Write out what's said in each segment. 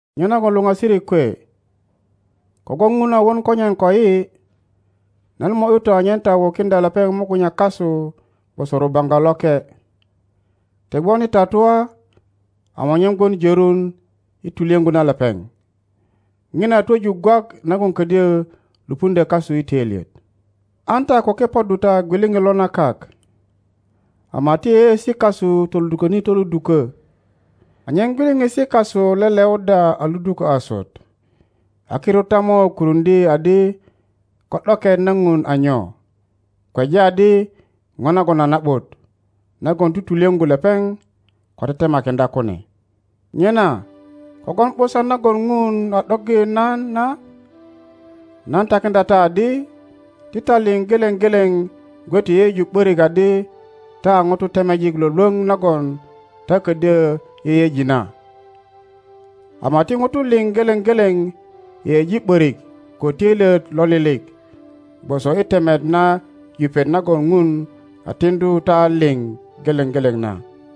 Nyenagon luŋasirik kwe, ko-gwon Ŋun a won konyen koyi, nan mo ’yu ta anyen ta wukiŋdya lepeŋ mugunya kasu gwoso rubaŋga loke, ti gwon i tatua, ama anyen gwon jörun i tulyöŋgu na lepeŋ.Ŋina a twöju gwak nagon ködyö lupuŋdyö kasu i töilyet. An ta ko kepoddu ta gwiliŋit lo na kak, ama ti yeyeosi kasu toluduköni toludukö anyen gwiliŋisi kasu leleuddya a ludukö asut; a kirut ta mo kuruŋdye adi ko ’doket na Ŋun a nyo, kweja adi ŋo nagon a na ’but, nagon tutulyöŋgu lepeŋ ko tetemakiŋdya kune. Nyena kogwon ’busan nagon Ŋun a ’doggi nan na, nan takiŋdya ta adi, ti ta liŋ geleŋ geleŋ gwe ti yeyeju ’borik adi ta a ŋutu temejik lwölwöŋ nagon ta ködyö yeyeji na, ama ti ŋutu liŋ geleŋ geleŋ yeyeji ’börik ko töilyet lo lilik gwoso i temet na yupet nagon Ŋun a tiŋdu ta liŋ geleŋ geleŋ na.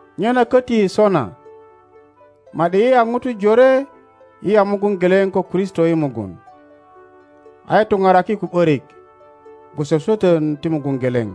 Nyena köti sona, ma ’di yi a ŋutu jore yi a mugun geleŋ ko Kristo i mugun, a yi tuparaki ko ’börik gwoso swötön ti mugun geleŋ.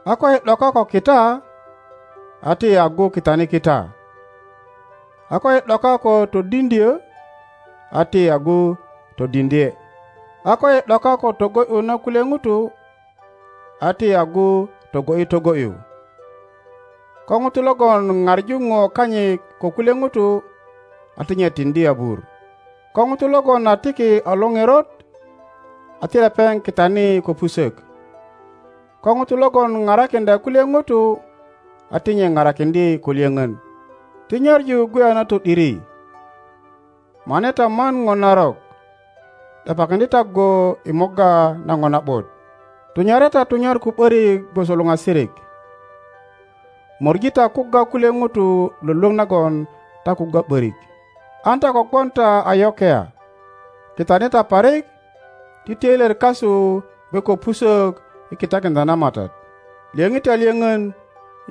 A koyi ’doka ko kita, a ti yi agu kitani kita; a koyi ’doka ko todiŋdyö, a ti yi agu todiŋdye. A koyi ’doka ko togo ’yu na kulye ŋutu, a ti yi agu togo ’yi togo ’yu. Ko ŋuto logon ŋaŋu ŋo kanyit ko kulye ŋutu, a ti nye tiŋdi abur. Ko ŋuto logon a tiki a lo ŋerot, a ti lepeŋ kitani ko pusök. Ko ŋuto logon parakiŋdya kulye ŋutu, a ti nye parakiŋdye ko lyöŋön. Ti nyaŋu gwe a na to ’diri. Mane ta man ŋo narok, ’depakiŋdye ta go i morga na ŋo na ’but. Tunyare ta tunyar ko ’börik gwoso luŋasirik, möŋi ta kugga kulye ŋutu lwölwöŋ nagon ta kugga ’börik. An ta ko gwon ta a yokia, kitani ta parik. Ti töilyet kasu gwe ko pusök i kitakiŋdya na Matat. Lyöŋi ta lyöŋön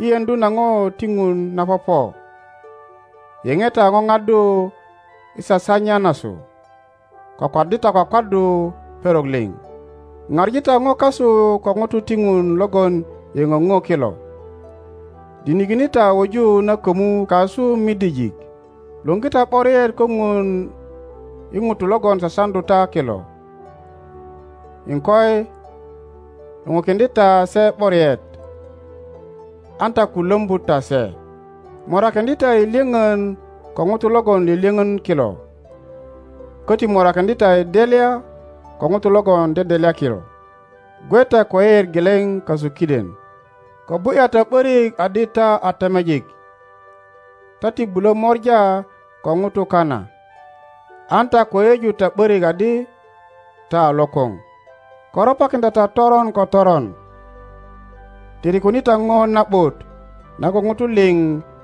i yeŋdu na ŋo ti Ŋun na popo. Yeoe ta ŋoŋaddu i sasanya nasu. Kwakwaddi ta kwakwaddu perok liŋ. Ŋaŋi ta ŋo kasu ko ŋutu ti Ŋun logon yöŋö ŋo kilo. Dinikine ta wuju na kömu kasu midijik. Luŋgi ta ’boriet ko Ŋun i ŋutu logon sasaŋdu ta kilo; iŋkoi, luŋukiŋdye ta se ’boriet, an ta ko lombu ta se. Morakiŋdye ta i lyöpön ko ŋutu logon lyölyöŋi kilo, köti morakiŋdye ta i delya ko ŋutu logon dedelya kilo. Gwe ta ko yeyeet geleŋ kasu kiden. Ko bu ’ya ta ’börik adi ta a temejik ta ti bulö mora ko ŋutu kana. An ta ko yeyeju ta ’börik adi ta a lokoŋ. Ko ropakiŋdya ta toron ko toron. Tirikuni ta ŋo na ’but nagon ŋutu liŋ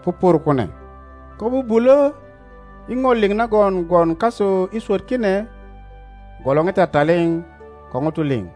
pupur kune. Ko bubulö, i ŋo liŋ nagon gwon kasu i swöt kine, gwolore ta taliŋ ko ŋutu liŋ.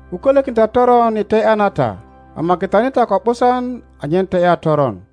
Ko kölökin ta toron i te ’ya na ta, ama kitani ta ko ’busan anyen te ’ya toron.